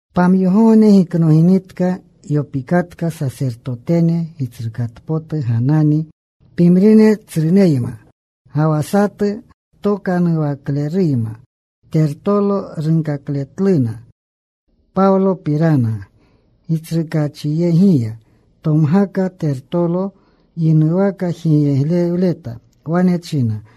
Pamyogogne giknoginitka yopikatka Sasertotene Gitsrukatpotu Ganani, pimrine tsruneyma, ga wa satu ktokanuwakleruyma, Tertolo. Runkakletluna Pawlopirana gitsrukaachyegiya. Tomgaka Tertolo. Yinuwaka jigyeglewleta. Wane china,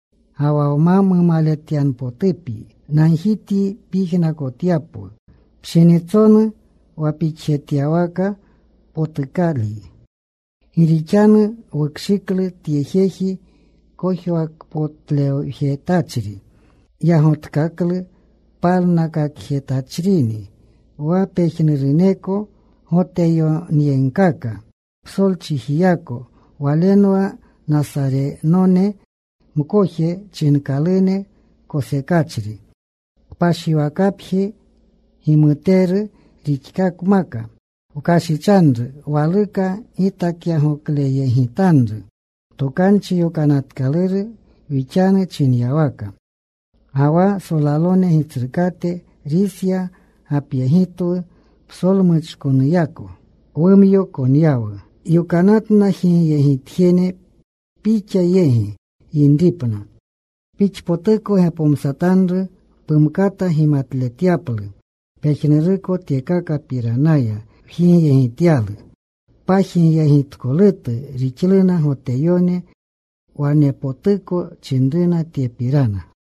Ga wa nma mumaletpotutyanupyi, nagjityi pyijnakotyapwu pshinitsonu wa pixjetyawaka potukalyi. “Gi rixanu wukshiklu tye jeji kojwakpotlewjetachri. Yagotkaklu palnakakjetachrini wa pejnuruneko Goteyoneyegkaka psolchijiyako. Walenwa Nasarenone mkoje chinkalune kosekachri Kpashwakapji gimuteru rixkakmaka. Wkashichanru. Waluka gitakyagokleyegitanru Tokanchi Yokanatkaluru wixanu chinyawaka. Ga wa solalone gitsrukate Risya gapyegitwu. Psolmuchkonuyako wumyo konyawu. Yokanatna jigyegitjene pixa yegi yinripna. Pixpotuko gepomsatanru, pumkata gimatletyaplu pejnuruko tyekakapiranaya wjigyegityalu.” Pajigyegitkolutu rixluna Goteyone. Wanepotuko chinruna tyepirana.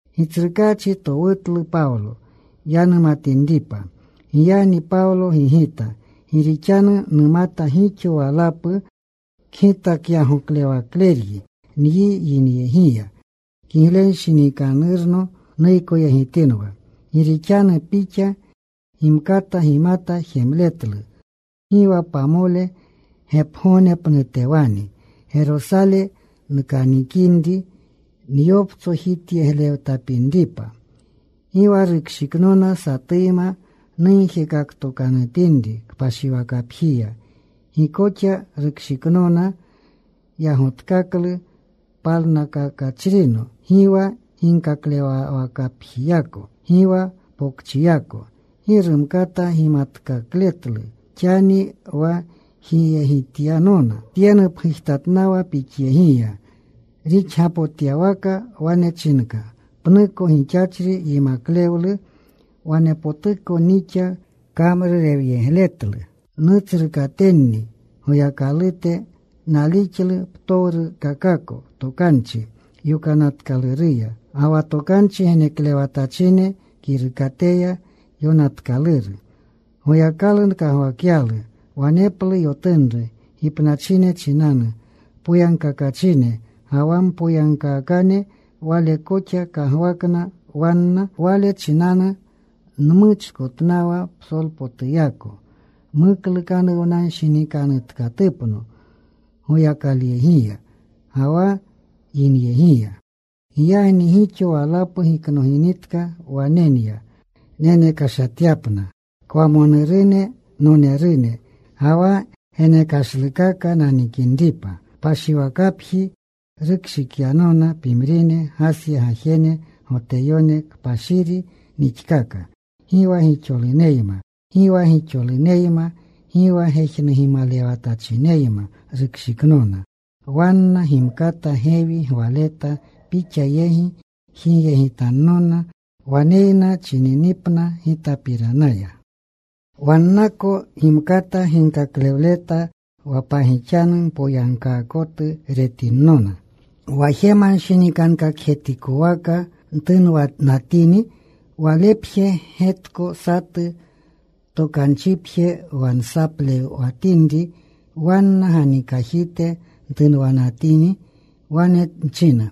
Gitsrukaachi towutlu Pawlo yanumatinripa. Giyagni Pawlo gigita, “Gi rixanu numata gixo walapu kgitakyagoklewakleryi nyi yinyegiya, kiglenshinikanurno nuykoyegitinwa. Gi rixanu pixa gimkata gimata jemletlu gi wa pamole gepgognepnutewani Gerosale nkanikinri nyoptsojityeglewtapinripa. Gi wa rukshiknona satuyma nugjekaktokanutinri kpashiwakapjiya. Gi koxa rukshiknona yagotkaklu palnakakachrino, gi wa ginkaklewwakapjiyako, gi wa pokchiyako. Gi rumkata gimatkakletlu xani wa jigyegityanona. Tye nupgujtatnawa pixyegiya, rixgapotyawaka wane chinka pnuko gixachri yimaklewlu, wanepotuko nixa kamrurewyegletlu nutsrukatenni Goyakalute. Nalixlu ptowrukakako Tokanchi Yokanatkaluruya ga wa tokanchi geneklewatachine kirukateya yonatkaluru. Goyakalu nkagwakyalu waneplu yotunru gipnachine chinanu, poyagkakachine ga wa mpoyagkaakane. Wale koxa kagwakna wanna. Wale chinanu nmuchkotnawa psolpotuyako muklukanuwnanshinikanutkatupno Goyakalyegiya ga wa yinyegiya. “Giyagni gixo walapu giknoginitka wane nya nenekashatyapna kwamonurune nonerune, ga wa genekashlukaka nanikinripa. Kpashiwakapji rukshikyanona pimrine Gasya gajene Goteyone. Kpashiri nixkaaka. Gi wa gixoluneyma, gi wa gejnugimalewanatachineyma rukshiknona. Wanna gimkata gewi gwaleta pixa yegi jigyegitannona waneyna chininipna gitapiranaya. Wannako gimkata ginkaklewleta wa pagixanu mpoyagkaakotu retinnona wa jemanshinikankakjetikowaka ntunwanatini. Walepje getko satu tokanchipje wa nsaplewatinri wanna ganikajite ntunwanatini. Wane nchina,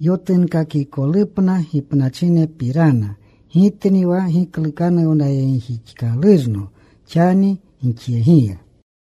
‘Yotunkakikolupna gipnachinepirana gitni wa giklukanuwnayegjixkalurno xani gixyegiya.’”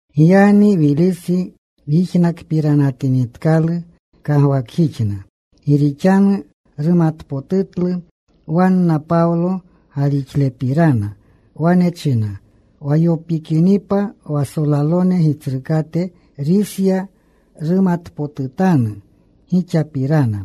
Giyagni Wilisi yijnakpiranatinitkalu kagwakjixna, gi rixanu rumatpotutlu wanna Pawlo galixlepirana. Wane china, “Wa yopikinipa wa solalone gitsrukate Risya, numatpotutanu gixapirana.”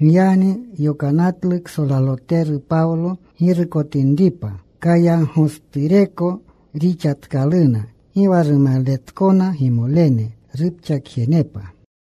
Giyagni yokanatlu ksolaloteru Pawlo girukotinripa. Kayaagostureko rixatkaluna. Gi wa rumaletkona gimolene rupxakjenepa.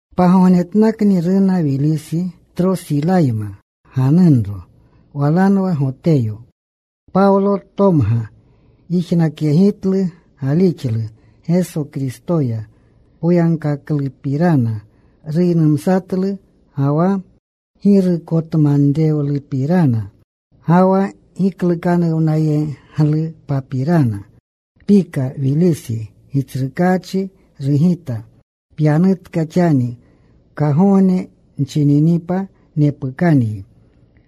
Pagognetnakni runa Wilisi Trosilayma ganunro. Walanwa Goteyo. Pawlo tomga. Yijnakyegitlu galixlu Geso Kristoya. Poyagkaklupirana ruynumsatlu, ga wa girukotmanrewlupirana, ga wa giklukanuwnayeglupapirana. Pika Wilisi gitsrukaachi. Rugita, “Pyanutka xani. Kagogne nchininipa nepukanyi.”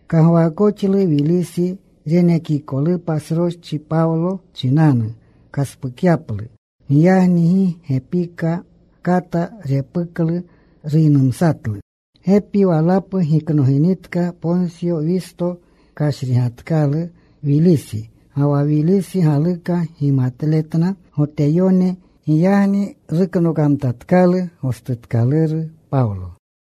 Kagwaakoxlu Wilisi renekikolupa sroschi Pawlo chinanu kaspukyaplu. Giyagni gi gepiko kata repuklu. Ruynumsatlu. Gepi walapu giknoginitka, Porsyo Wisto kashrigatkalu Wilisi. Ga wa Wilisi galuka gimutletna Goteyone. Giyagni ruknokamtatkalu gostutkaluru Pawlo.